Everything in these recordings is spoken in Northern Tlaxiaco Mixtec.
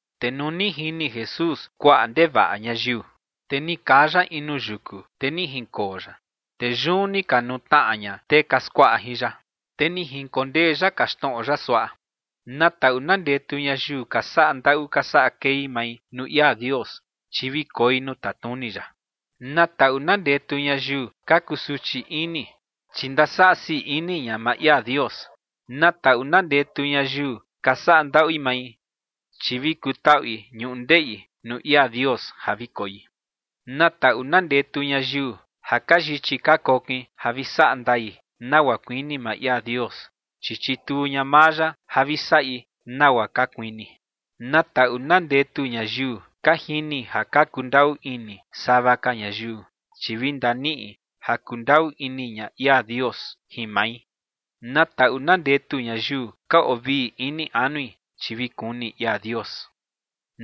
Te nuu ni jini Jesús kuaꞌa ndevaꞌa ñayiu, te ni kaa ya in nuu yuku, te ni jinkoo ya. Te yun ni ka nutnaꞌa ña tee ka skuaꞌa jin ya. Te ni jinkondee ya kaxtnoꞌo ya suaꞌa: ͏―͏Na taꞌu na ndetu ñayiu ka saꞌa ndaꞌu ka saꞌa kei mai nuu ia Dios, chi vi koi nuu tatnuni ya. ’Na taꞌu na ndetu ñayiu ka kusuchi ini, chi ndasaꞌa sii ini ña maa ia Dios. ’Na taꞌu na ndetu ñayiu ka saꞌa ndaꞌui mai, chi vi kutaꞌui ñundeꞌi nuu ia Dios ja vi koi. ’Na taꞌu na ndetu ñayiu ja ka yichi ka kokin ja vi saꞌa ndai nagua kuini maa ia Dios, chi chituu ña maa ya ja vi saꞌi nagua ka kuini. ’Na taꞌu na ndetu ñayiu ka jini ja ka kundaꞌu ini sava ka ñayiu, chi vi ndaniꞌi ja kundaꞌu ini ña ia Dios jin mai. ’Na taꞌu na ndetu ñayiu ka oo vii ini anui, chi vi kuni ia Dios.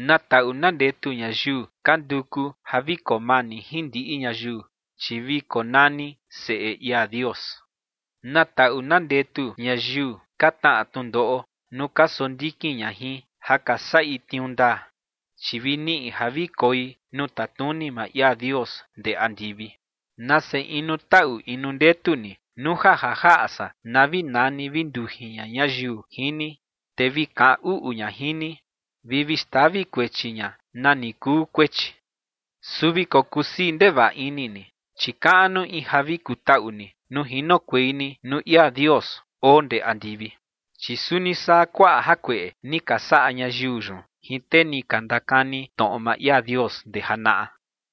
’Na taꞌu na ndetu ñayiu ka nduku ja vi koo mani jin ndiꞌi ñayiu, chi vi konani seꞌe ia Dios. ’Na taꞌu na ndetu ñayiu ka tnaꞌa tnundoꞌo nuu ka sondikin ña jin ja ka saꞌi tniuu ndaa, chi vi niꞌi ja vi koi nuu tatnuni maa ia Dios ndee andivi. ’Nase inu taꞌu inu ndetu ni nuu ja ja jaꞌa san na vi nani vi ndujin ña ñayiu jin ni, te vi kaꞌan uꞌu ña jin ni, vi vi xtavi kuechi ña nani kuu kuechi. Su vi kokusii ndevaꞌa ini ni, chi kaꞌnu in ja vi kutaꞌu ni nuu jinokuei ni nuu ia Dios oo ndee andivi, chi suni saa kuaꞌa jakueꞌe ni ka saꞌa ñayiu yun jin tee ni ka ndakani tnoꞌo maa ia Dios ndee janaꞌa.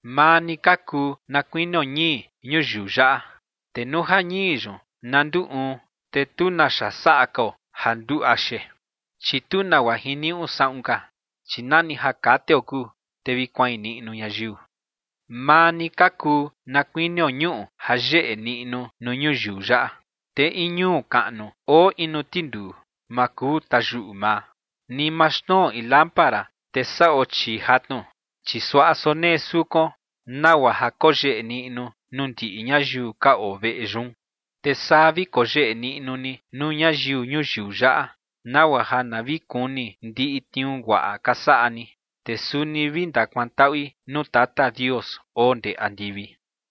’Maa ni ka kuu na kuinio ñii ñuyiu yaꞌa. Te nuu ja ñii yun na nduu uun, te tu naxa saꞌa kao ja nduu axe. Chi tu nagua jiniuꞌu saꞌun ka, chi nani ja kateo kuu, te vi kuain niꞌnu ñayiu. ’Maa ni ka kuu na kuinio ñuꞌu ja yeꞌe niꞌnu nuu ñuyiu yaꞌa. Te in ñuu kaꞌnu oo in nuu tinduu ma kuu tayuꞌu maa. Ni ma xnuo in lámpara te saꞌo chii jatnu, chi suaꞌa sonee sukuon nagua ja koyeꞌe niꞌnu nuu ndiꞌi ñayiu ka oo veꞌe yun. Te saa vi koyeꞌe niꞌnu ni nuu ñayiu ñuyiu yaꞌa, nagua ja na vi kuni ndiꞌi tniuu guaꞌa ka saꞌa ni, te suni vi ndakuantaꞌui nuu Tata Dios oo ndee andivi.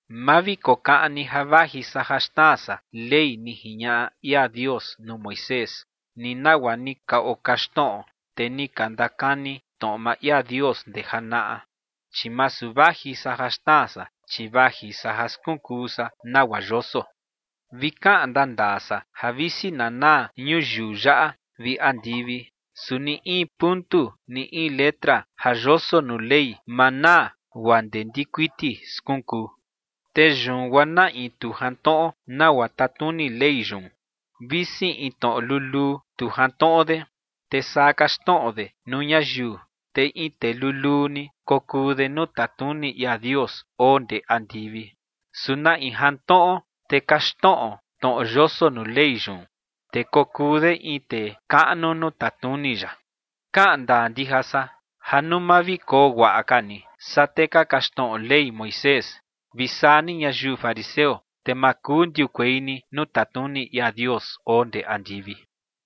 ’Ma vi kokaꞌan ni ja vaji san ja xnaa san Ley ni jiñaꞌa ia Dios nuu Moisés, ni nagua ni ka okaxtnoꞌo tee ni ka ndakani tnoꞌo maa ia Dios ndee janaꞌa, chi masu vaji san ja xnaa san, chi vaji san ja skunkuu san nagua yoso. Vi kaꞌan ndandaa san ja visi na naa ñuyiu yaꞌa vi andivi, su ni in puntu ni in letra ja yoso nuu Ley ma naa guaa ndee ndikuiti skunkuu. Te yun guaa na in tu jantnoꞌo nagua tatnuni Ley yun, visi in tnoꞌo luluu tu jantnoꞌo de, te saa kaxtnoꞌo de nuu ñayiu, te in tee luluu ni kokuu de nuu tatnuni ia Dios oo ndee andivi. Su na in jantnoꞌo te kaxtnoꞌo tnoꞌo yoso nuu Ley yun, te kokuu de in tee kaꞌnu nuu tatnuni ya. Kaꞌan ndaa ndija san ja nuu ma vi koo guaꞌa ka ni saa tee ka kaxtnoꞌo Ley Moisés vi saa ni ñayiu fariseo, te ma kuu ndiukuei ni nuu tatnuni ia Dios oo ndee andivi.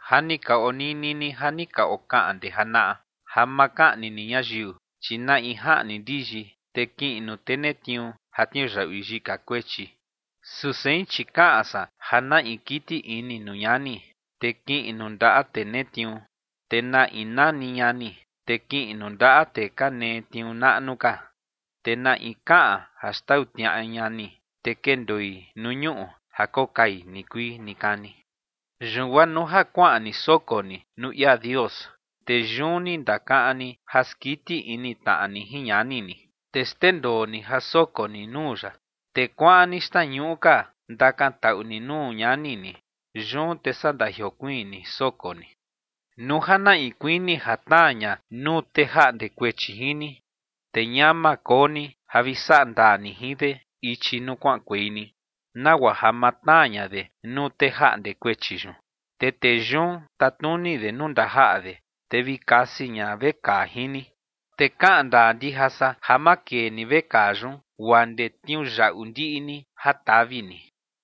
’Ja ni ka onini ni ja ni ka okaꞌan ndee janaꞌa ja ma kaꞌni ni ñayiu, chi na in jaꞌni ndiyi, te kiꞌin nuu tee netniuu ja tniuyaꞌui yika kuechi. Su sein, chi kaꞌan san ja na in kiti ini nuu ñani, te kiꞌin nuu ndaꞌa tee netniuu. Te na in nani ñani, te kiꞌin nuu ndaꞌa tee ka netniuu naꞌnu ka. Te na in kaꞌan ja xtau tniaꞌa ñani, te kendoi nuu ñuꞌu ja kokai nikuii nikani. ’Yun guaa nuu ja kuaꞌan ni soko ni nuu ia Dios, te yun ni ndakaꞌan ni ja skiti ini tnaꞌa ni jin ñani ni, te xndendoo ni ja soko ni nuu ya, te kuaꞌan ni xtnañuꞌu ka ndakantaꞌu ni nuu ñani ni. Yun te saa ndajiokuiin ni soko ni. ’Nuu ja na in kuini ja tnaa ña nuu tee jaꞌnde kuechi jin ni, te ñama koo ni ja vi saꞌa ndaa ni jin de ichi nuu kuaꞌankuei ni, nagua ja ma tnaa ña de nuu tee jaꞌnde kuechi yun, te tee yun tatnuni de nuu ndajaꞌa de, te vi kasi ña vekaa jin ni. Te kaꞌan ndaa ndija san ja ma kee ni vekaa yun guaa ndee tniuyaꞌu ndiꞌi ni ja tavi ni.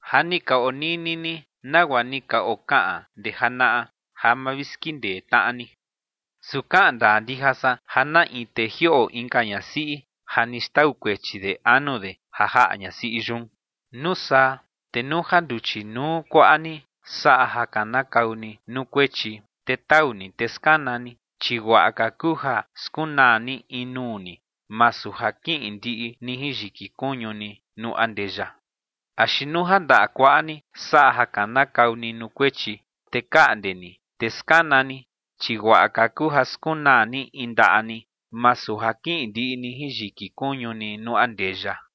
’Ja ni ka onini ni nagua ni ka okaꞌan ndee janaꞌa ja ma vi skindee tnaꞌa ni. Su kaꞌan ndaa ndija san ja na in tee jioꞌo inka ñasiꞌi ja ni xtau kuechi de anu de ja jaꞌa ñasiꞌi yun. ’Nuu saa, te nuu ja nduchi nuu kuaꞌa ni saꞌa ja kanakau ni nuu kuechi, te tau ni, te skana ni, chi guaꞌa ka kuu ja skunaa ni in nuu ni masu ja kiꞌin ndiꞌi ni jin yiki kuñu ni nuu andeya. Axi nuu ja ndaꞌa kuaꞌa ni saꞌa ja kanakau ni nuu kuechi, te kaꞌnde ni, te skana ni, chi guaꞌa ka kuu ja skunaa ni in ndaꞌa ni, masu ja kiꞌin ndiꞌi ni jin yiki kuñu ni nuu andeya.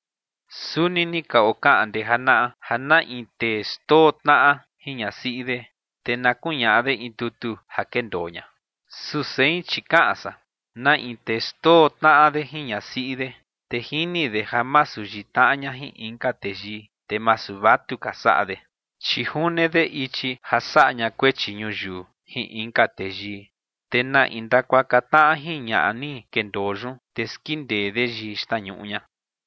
’Suni ni ka okaꞌan ndee janaꞌa ja na in tee xndoo tnaꞌa jin ñasiꞌi de, te na kuñaꞌa de in tutu ja kendoo ña. Su sein, chi kaꞌan san: Na in tee xndoo tnaꞌa de jin ñasiꞌi de, te jini de ja masu yitnaꞌa ña jin inka teyii, te masu vatuka saꞌa de, chi june de ichi ja saꞌa ña kuechi ñuyiu jin inka teyii. Te na in ndakuaka tnaꞌa jin ñaꞌa ni kendoo yun, te skindee de yii xtnañuꞌu ña.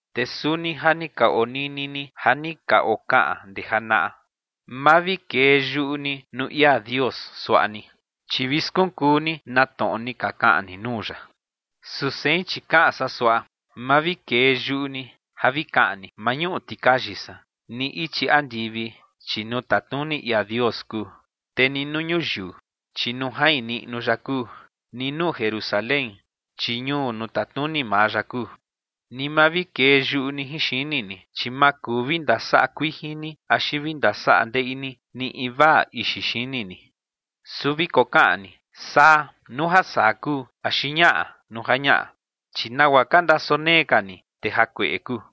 ’Te suni ja ni ka oo nini ni ja ni ka okaꞌan ndee janaꞌa: “Ma vi kee yuꞌu ni nuu ia Dios suaꞌa ni, chi vi skunkuu ni na tnoꞌo ni ka kaꞌan ni nuu ya”. Su sein, chi kaꞌan san suaꞌa: Ma vi kee yuꞌu ni ja vi kaꞌan ni: “¡Mañuꞌu tikayi san!” ni ichi andivi, chi nuu tatnuni ia Dios kuu, te ni nuu ñuyiu, chi nuu jain niꞌnu ya kuu, ni nuu Jerusalén, chi ñuu nuu tatnuni maa ya kuu. Ni ma vi kee yuꞌu ni jin xini ni, chi ma kuu vi ndasaꞌa kuijin ni axi vi ndasaꞌa ndeꞌi ni ni invaa ixi xini ni. Su vi kokaꞌan ni: “Saa”, nuu ja saa kuu, axi “ñaꞌa”, nuu ja ñaꞌa. Chi nagua ka ndasonee ka ni, te jakueꞌe kuu.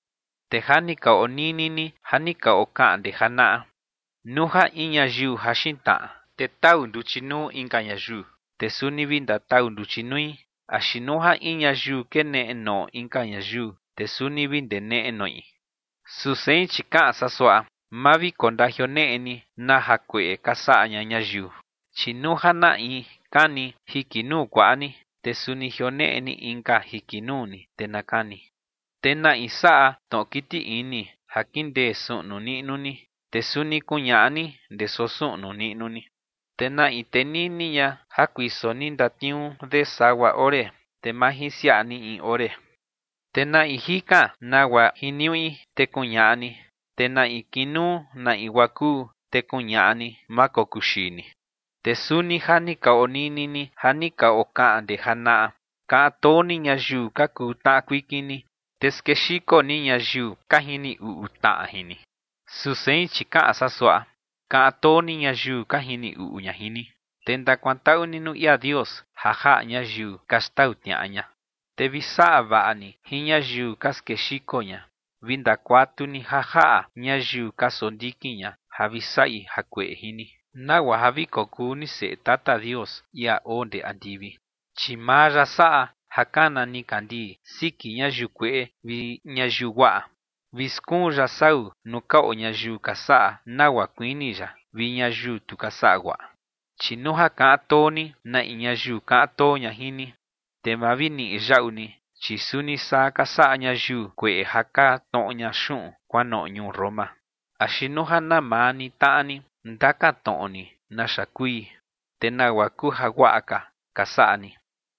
’Te ja ni ka onini ni ja ni ka okaꞌan ndee janaꞌa: “Nuu ja in ñayiu jaxin tnaꞌa, te tau nduchi nuu inka ñayiu, te suni vi ndatau nduchi nui, axi nuu ja in ñayiu keneꞌe noꞌo inka ñayiu, te suni vi ndeneꞌe noꞌi”. Su sein, chi kaꞌan san suaꞌa: Ma vi kondajioneꞌe ni na jakueꞌe ka saꞌa ña ñayiu. Chi nuu ja na in kani jiki nuu kuaꞌa ni, te suni jioneꞌe ni inka jiki nuu ni, te na kani. Te na in saꞌa tnoꞌo kiti ini ja kindee suꞌnu niꞌnu ni, te suni kuñaꞌa ni ndee soo suꞌnu niꞌnu ni. Te na in tenini ña ja kuiso ni ndatniuu de sagua ore, te majinsiaꞌa ni in ore. Na in jikan nagua jiniuꞌi, te kuñaꞌa ni. Te na in kinuu na in guaa kuu, te kuñaꞌa ni, ma kokuu xii ni. ’Te suni ja ni ka onini ni ja ni ka okaꞌan ndee janaꞌa: “Kaꞌan too ni ñayiu ka kuu tnaꞌa kuikin ni, te skexiko ni ñayiu ka jini uꞌu tnaꞌa jin ni”. ’Su sein, chi kaꞌan san suaꞌa: Kaꞌan too ni ñayiu ka jini uꞌu ña jin ni, te ndakuantaꞌu ni nuu ia Dios ja jaꞌa ñayiu ka xtau tniaꞌa ña, te vi saꞌa vaꞌa ni jin ñayiu ka skexiko ña, vi ndakuatu ni ja jaꞌa ñayiu ka sondikin ña ja vi saꞌi jakueꞌe jin ni, nagua ja vi kokuu ni seꞌe Tata Dios, ia oo ndee andivi, chi maa ya saꞌa ja kana nikandii siki ñayiu kueꞌe vi ñayiu guaꞌa, vi skuun ya sau nuu ka oo ñayiu ka saꞌa nagua kuini ya vi ñayiu tu ka saꞌa guaꞌa. Chi nuu ja kaꞌan too ni na in ñayiu kaꞌan too ña jin ni, te ma vi niꞌi yaꞌu ni, chi suni saa ka saꞌa ñayiu kueꞌe ja ka tnoꞌo ña xuꞌun kuanoꞌo ñuu Roma. Axi nuu ja na maa ni tnaꞌa ni ndakan tnoꞌo ni naxa kui, te nagua kuu jaguaꞌa ka ka saꞌa ni,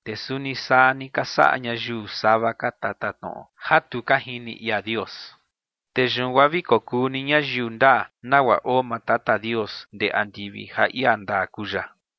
te suni saa ni ka saꞌa ñayiu sava ka tatatnoꞌo ja tu ka jini ia Dios. Te yun guaa vi kokuu ni ñayiu ndaa, nagua oo maa Tata Dios ndee andivi, ja ia ndaa kuu ya.